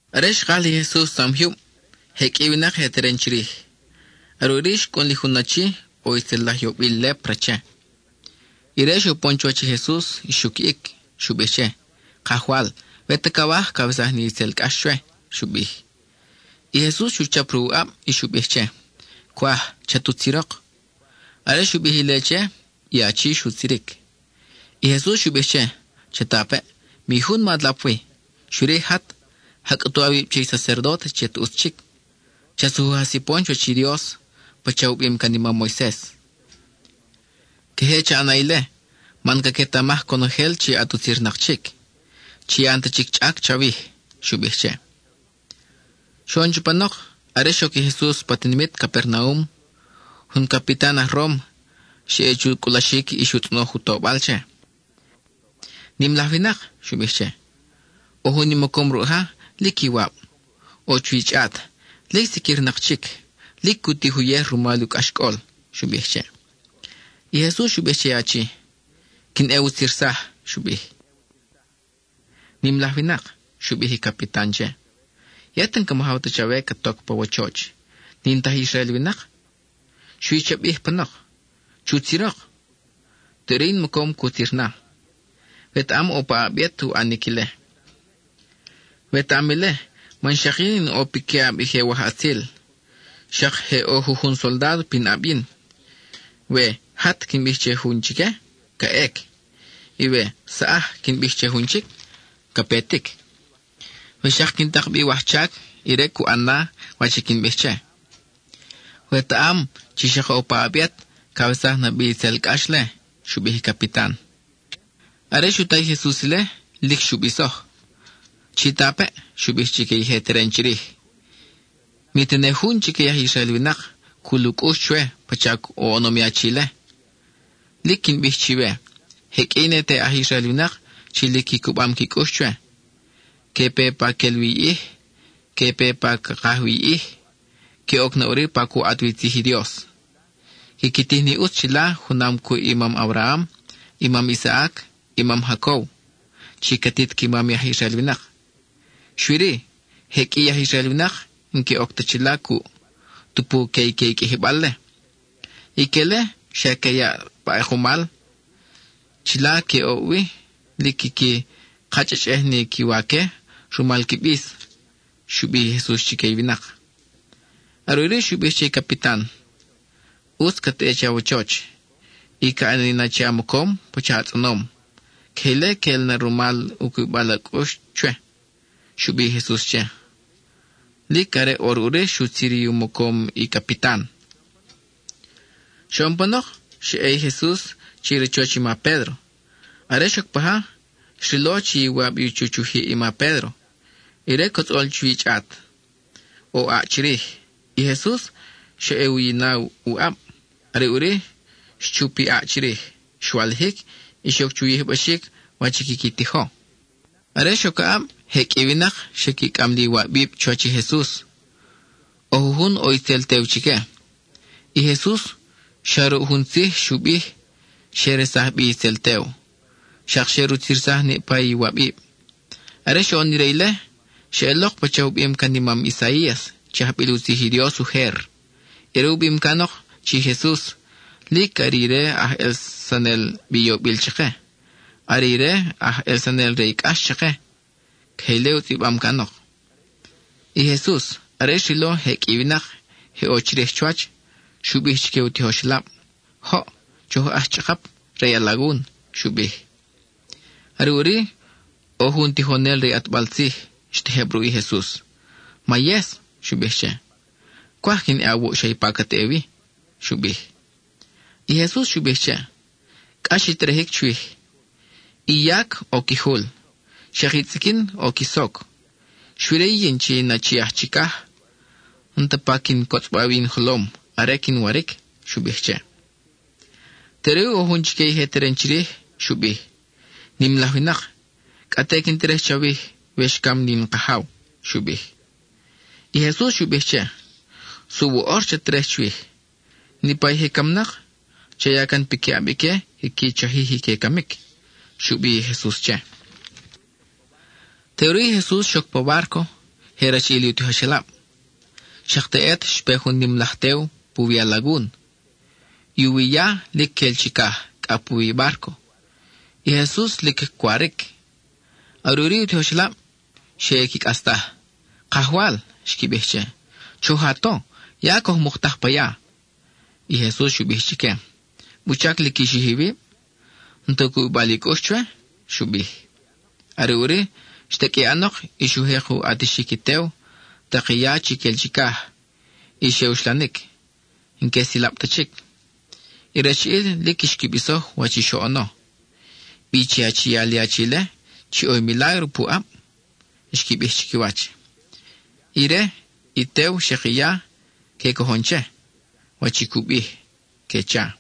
Are xkaj li Jesus tzam jyub, je qʼui i winak je teren chirij. Are ʼuri xcʼun li jun achi, ʼo i tzel laj yobil lépra che. Ire xupon chuwach i Jesus y xuquiʼic. Xu bij che: —Kajwal, we ta cawaj, cawesaj ni itzel cʼax chwe —xu bij. I Jesus xu chap ruʼ u ʼab, y xu bij che: —Cwaj. Chat utzirok. Are xu bij ile che, i achi xutziric. I Jesus xu bij che: —Chatapeʼ, mi jun ma lap wi. Xui-ri, jat, ja cʼutu awib che i sacerdóte chi at ʼutz chic; cha sujuj a sipon chuwach i Dios pacha u bim can i mam Moises. Queje cha ʼana ile man caquetamaj conojel chi at utzirnak chic, chi ya n-ta chic i chʼac chawij —xu bij che. Xoʼon chupanok, are xoc i Jesus pa tinimit Capernaum, jun capitan aj Róma xa ʼe chu cʼulaxic y xu tzʼonoj u tobal che. —Nim laj winak —xu bij che—, ʼo jun in mocom ruʼ ja, lic iwab. ʼO chuwi chʼat, lic siquirnak chic; lic cu tij uyej rumal u cʼaxcʼol —xu bij che. I Jesus xu bij che i achi: —Quin ʼe wutzirsaj —xu bij. —Nim laj winak —xu bij i capitan che—, yet n-ca majaw ta chawe cat oc pa wachoch; n-in ti aj Israel winak. Xui cha bij panok: ¡Chutzirok! Teʼuri in mocom cutzir na. Wetaʼam ʼo paʼab yet u ʼanic ile. Wetaʼam ile man xak yin in ʼo piquiʼab i je wajʼatzil; xak je ʼo jujun soldádo pinʼab yin. We “¡Jat!” quin bij che jun chique, ca ʼec; y we “¡Saʼaj!” quin bij che jun chic, ca petic. We xak quin tak bi wajchac, ire cu ʼan na wach i quin bij che. Wetaʼam chi xak ʼo paʼab yet cawesaj na bi itzel cʼax-le —xu bij i capitan. Are xu ta i Jesus ile, lic xu bisoj. —Chitapeʼ —xu bij chique i je teren chirij—, mi tene jun chique i aj Israel winak cul u cʼux chwe pacha oʼonom i achi-le. Lic quin bij chiwe, je qʼui i ne te aj Israel winak chi lic qui cubam qui cʼux chwe, que pe pa quel wi i ʼij, que pe pa ca kaj wi i ʼij, que oc na ʼuri pa cu ʼat wi tzij i Dios; quiqui tij ni ʼutz chila junam cuʼ i mam Abraham, i mam Isaac, i mam Jacob, i catit qui mam i aj Israel winak. Xui-ri, je qʼui i aj Israel winak n-que oc ta chila cuʼ, tupu que ique i qʼuijibal-le. Ique-le, xa que yaʼ na pa ʼekumal; chila que oʼ wi, lic quiqui kachʼachʼej ni qui waque rumal qui bis —xu bij i Jesus chique i winak. Are ʼuri xu bij che i capitan: —ʼUtz cat ʼe che awachoch, y ca ʼani na che a mocom pacha a tzʼonom; queje ile queʼel na rumal u cubibal a cʼux chwe —xu bij i Jesus che. Lic are ʼor ʼuri xutzir i u mocom i capitan. Xoʼon panok, xa ʼe i Jesus che i rachoch i ma Pédro. Are xoc paja, xrilo chi iwab u chuch u jiʼ i ma Pédro; ire cotzʼol chuwi chʼat, ʼo ʼaʼ chirij. I Jesus xa ʼe u yina u ʼab; are ʼuri, xchup i ʼaʼ chirij, xwalijic y xoc chu yijbaxic wach i quiqui tijo. Are xoc aʼab, je qʼui i winak xe qui cʼam li iwabib chuwach i Jesus. ʼO jujun ʼo itzel tew chique; i Jesus, xa ruʼ jun tzij xu bij, xe resaj bic; xak xe rutzirsaj niʼpa i iwabib. Are xoʼon ire ile, xeʼelok pacha u bim can i mam Isaías, chi ajbil u tzij i Dios ujer. Ire u bim canok chi i Jesus “Lic are ire aj ʼelsanel bi yobil chake; are ire aj ʼelsanel re i cʼax chake.” (Queje ile u tzʼibam canok.) I Jesus, are xrilo je qʼui i winak je ʼo chirij chuwach, xu bij chique u tijoxelab: —Joʼ, choj ʼax chʼakap re i alagun —xu bij. Are ʼuri, ʼo jun tijonel re i ʼatbal tzij xtejeb ruʼ i Jesus. —Mayes —xu bij che—, cwaj quin ʼe awuʼ xa ipa cat ʼe wi —xu bij. I Jesus xu bij che: —Cʼax i terejic chwij. I yac ʼo qui jul, xak i tzʼiquin ʼo qui soc, xui-ri yin chi in Achi aj Chicaj, n-ta pa quin cotzʼba wi in jolom are quin waric —xu bij che. Teʼuri ʼo jun chique i je teren chirij xu bij: —Nim laj winak, cʼa te quin terej chawij we xcam ni in kajaw —xu bij. I Jesus xu bij che: —Suʼ woʼor chat terej chwij. Niʼpa i je camnak, cha ya can piquiʼab ique quiqui chajij i que camic —xu bij i Jesus che. Teʼuri i Jesus xoc pa bárco, je rachiʼil u tijoxelab. Xak teʼet xpe jun nim laj tew puwi i alagun; i u wi ya, lic quel chicaj, cʼa puwi i bárco. I Jesus, lic cwaric. Are ʼuri i u tijoxelab xe ʼe qui cʼastaj. —Kajwal —xqui bij che—, ¡Choj a to! ¡Ya coj muktaj pa ya! I Jesus xu bij chique: —¿Wuchac lic qui xij iwib? ¿N-ta u cubibal i cʼux chwe? —xu bij. Are ʼuri, xtaqʼui ʼanok y xu jek u ʼatixic i tew, tak i ya chi quel chicaj; y xe uxlanic, n-que silab ta chic. I rachiʼil lic xqui bisoj wach i xoʼono. —¿Bi chi achial i achi-le chi ʼo i milágro puʼab? —xqui bij chiquiwach—. Ire, i tew, xak i ya, que cojon che, wach i cu bij —que cha.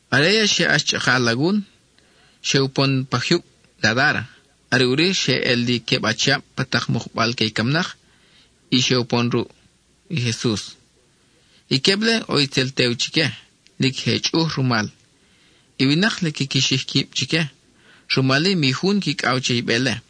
Are ya xe ʼax chʼaka alagun, xe upon pa jyub Gadára. Are ʼuri xe ʼel li queb achiab pa tak mukbal que i camnak y xe upon ruʼ i Jesus. I queb-le, ʼo itzel tew chique, lic je chʼuj rumal; i winak lic quiqui xij quib chique, rumal-i, mi jun quicʼaw che i be-le.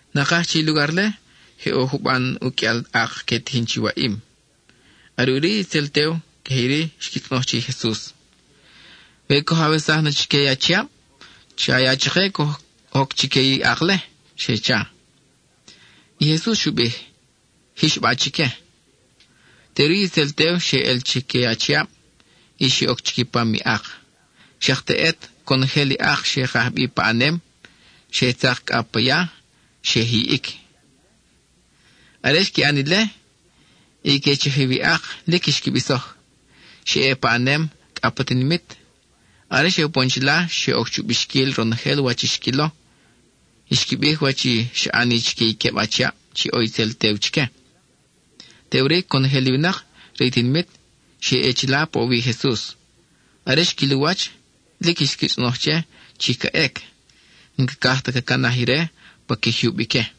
Nakaj che i lugar-le, je ʼo juban uqʼuial ak que tijin chi waʼim. Are ʼuri i itzel tew queje iri xqui tzʼonoj che i Jesus: —We coj awesaj na chique i achiab, cha ya chake coj oc chique i ak-le —xe cha. I Jesus xu bij: —Jix ba chique. Teʼuri i itzel tew xe ʼel chique achiab y xe oc chiquipam i ak. Xak teʼet conojel i ak xe kaj bi paʼanem, xe ʼe tzak pa ya y xe jiʼic. Are xqui ʼan ile, i que chajiw i ak lic xqui bisoj. Xe ʼe paʼanem cʼa pa tinimit. Are xe upon chila, xe oc chu bixquil ronojel wach i xquilo; xqui bij wach i xa ʼani chique i queb achiab chi ʼo itzel tew chique. Teʼuri conojel i winak re i tinimit xe ʼe chila paʼowi i Jesus. Are xquil u wach, lic xqui tzʼonoj che chi ca ʼec; n-cacaj ta ca canaj ire pa qui jyub ique.